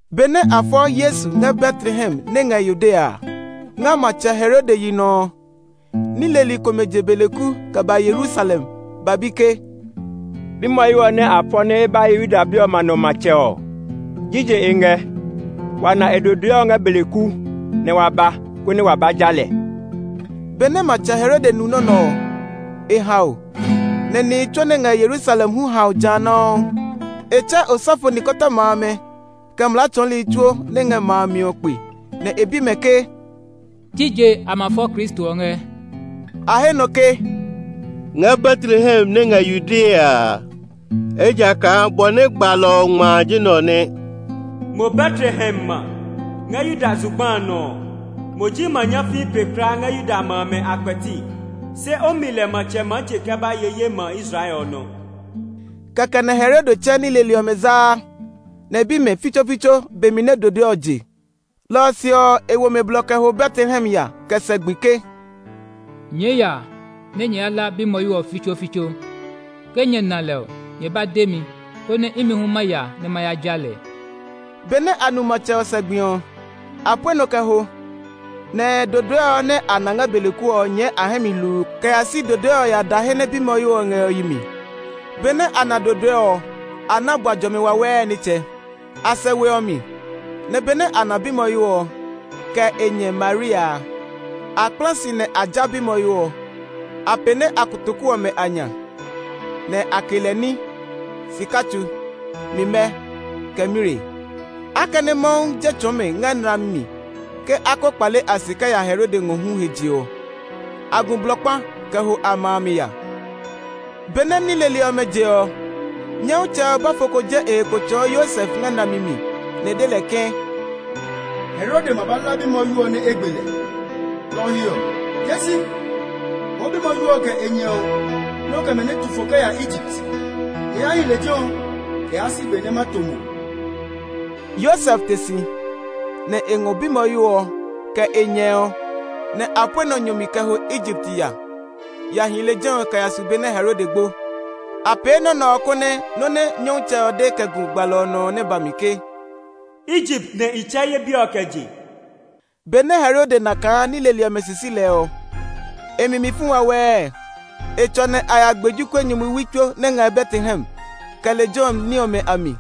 Benɛ a fɔ Yesu ngɛ Betlehem nɛ ngɛ Yudea, ngɛ Matsɛ Herode yi nɔ ɔ, ní leli komɛ je beleku kɛ ba Yerusalem ba bi ke, “Bimwɔyo ɔ nɛ a fɔ nɛ e ba ye Yuda bi ɔmɛ a nɔ matsɛ ɔ, jije e ngɛ? Wa na e dodoe ngɛ beleku, nɛ wa ba, konɛ wa ba ja lɛ.” Benɛ Matsɛ Herode nu nɔ́ nɛ ɔ, e hao, nɛ nihi tsuo nɛ ngɛ Yerusalem hu hao ja nɔuu. E tsɛ osɔfo nikɔtɔma amɛ, kɛ mlaa tsɔɔli tsuo nɛ ngɛ ma a mi ɔ kpe, nɛ e bi mɛ ke, “Jije a ma fɔ Kristo ɔ ngɛ?” A he nɔ ke, “Ngɛ Betlehem nɛ ngɛ Yudea a. Ejakaa bɔ nɛ gbalɔ ɔ ngma ji nɛ ɔ nɛ: ‘Mo Betlehem ma, ngɛ Yuda zugba a nɔ ɔ, mo ji ma nyafii pe kulaa ngɛ Yuda ma amɛ a kpɛti; se o mi lɛ matsɛ maa je kɛ ba ye ye ma Israel ɔ nɔ.’” Kɛkɛ nɛ Herode tsɛ ní leli ɔmɛ zaa, nɛ e bi mɛ fitsofitso be mi nɛ dodoe ɔ je. Lɔ ɔ se ɔ, e wo mɛ blɔ kɛ ho Betlehem ya kɛ sɛ gbi ke, “Nyɛɛ ya nɛ nyɛ ya hla bimwɔyo ɔ fitsofitso. Ke nyɛ na lɛ ɔ, nyɛ ba de mi, konɛ imi hu ma ya nɛ ma ya ja lɛ.” Benɛ a nu matsɛ ɔ sɛ gbi ɔ, a pue nɔ kɛ ho. Nɛ ɛ dodoe ɔ nɛ a na ngɛ beleku ɔ nyɛɛ a hɛ mi hluu kɛ ya si dodoe ɔ ya da he nɛ bimwɔyo ɔ ngɛ ɔ yi mi. Benɛ a na dodoe ɔ, a na bua jɔmi wawɛɛ nitsɛ. A sɛ we ɔ mi, nɛ benɛ a na bimwɔyo ɔ, kɛ e nyɛ Maria a, a kpla si nɛ a ja bimwɔyo ɔ. A pɛne a kotoku ɔmɛ a nya, nɛ a ke lɛ ní: sika tsu, mimɛ, kɛ mire. Akɛnɛ Mawu je tsɔɔ mɛ ngɛ nlami mi ke a ko kpale a se kɛ ya Herode ngɔ hu he je ɔ, a gu blɔ kpa kɛ ho a ma mi ya. Benɛ ní leli ɔmɛ je ɔ, Nyɔmtsɛ ɔ bɔfo ko je e he kpo tsɔɔ Yosef ngɛ nlami mi, nɛ e de lɛ ke, “Herode ma ba hla bimwɔyo ɔ nɛ e gbe lɛ. Lɔ ɔ he ɔ, tee si! Ngɔɔ bimwɔyo ɔ, kɛ e nyɛ ɔ, nɛ o kɛ mɛ nɛ tu fo kɛ ya Egipt. Nyɛ ya hi lejɛ ɔ kɛ yaa si be nɛ ma to mo.” Yosef te si, nɛ e ngɔ bimwɔyo ɔ, kɛ e nyɛ ɔ, nɛ a pue nɔ nyɔ mi kɛ ho Egipt ya ya hi lejɛ ɔ kɛ ya su be nɛ Herode gbo. A pee nɔ́ nɛ ɔ, konɛ nɔ́ nɛ Nyɔmtsɛ ɔ de kɛ gu gbalɔ ɔ nɔ ɔ nɛ ba mi ke, “Egipt nɛ i tsɛ ye bi ɔ kɛ je.” Benɛ Herode na kaa ní leli ɔmɛ sisi lɛ ɔ, e mi mi fu wawɛɛ. E tsɔ nɛ a ya gbe jokuɛ nyumuwi tsuo nɛ ngɛ Betlehem, kɛ lejɛ ɔ ní ɔmɛ a mi;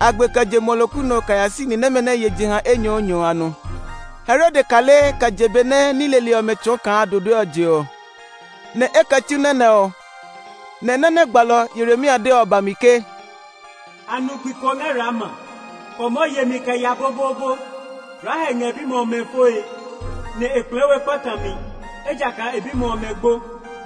a gbe kɛ je muɔloku nɔ kɛ ya si ni nɛmɛ nɛ ye jeha enyɔɔnyɔ a nɔ. Herode kale kɛ je be nɛ ní leli ɔmɛ tsɔɔ kaa dodoe ɔ je ɔ, nɛ e kɛ tsu nɔ́ nɛ ɔ. Nɛ nɔ́ nɛ gbalɔ Yeremia de ɔ ba mi ke, “A nu gbi ko ngɛ Rama, kɔmɔ yemi kɛ ya boboobo. Rahel ngɛ e bimɛ ɔmɛ foe, nɛ e kplɛɛ we kpatami, ejakaa e bimɛ ɔmɛ gbo.”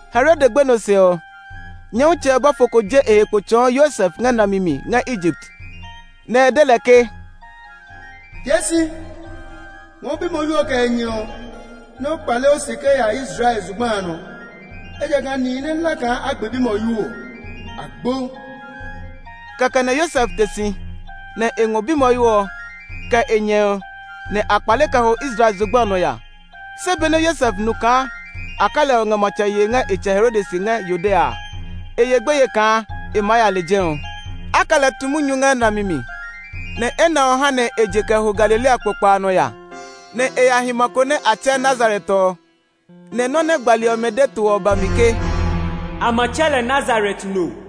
Herode gbenɔ se ɔ, Nyɔmtsɛ ɔ bɔfo ko je e he kpo tsɔɔ Yosef ngɛ nlami mi ngɛ Egipt, nɛ e de lɛ ke, “Tee si! Ngɔɔ bimwɔyo ɔ, kɛ e nyɛ ɔ, nɛ o kpale o se kɛ ya Israel zugba a nɔ. Ejakaa nihi nɛ hla kaa a gbe bimwɔyo ɔ, a gbo.” Kɛkɛ nɛ Yosef te si, nɛ e ngɔ bimwɔyo ɔ, kɛ e nyɛ ɔ, nɛ a kpale kɛ ho Israel zugba a nɔ ya. Se benɛ Yosef nu kaa Arkelao ngɛ matsɛ yee ngɛ e tsɛ Herode se ngɛ Yudea a, e ye gbeye kaa e maa ya lejɛ ɔ. A kɛ lɛ tu munyu ngɛ nlami mi, nɛ enɛ ɔ ha nɛ e je kɛ ho Galilea kpokpa a nɔ ya, nɛ e ya hi ma ko nɛ a tsɛɛ Nazaret ɔ. Nɛ nɔ́ nɛ gbali ɔmɛ de to ɔ ba mi ke, “A ma tsɛ lɛ Nazaret no.”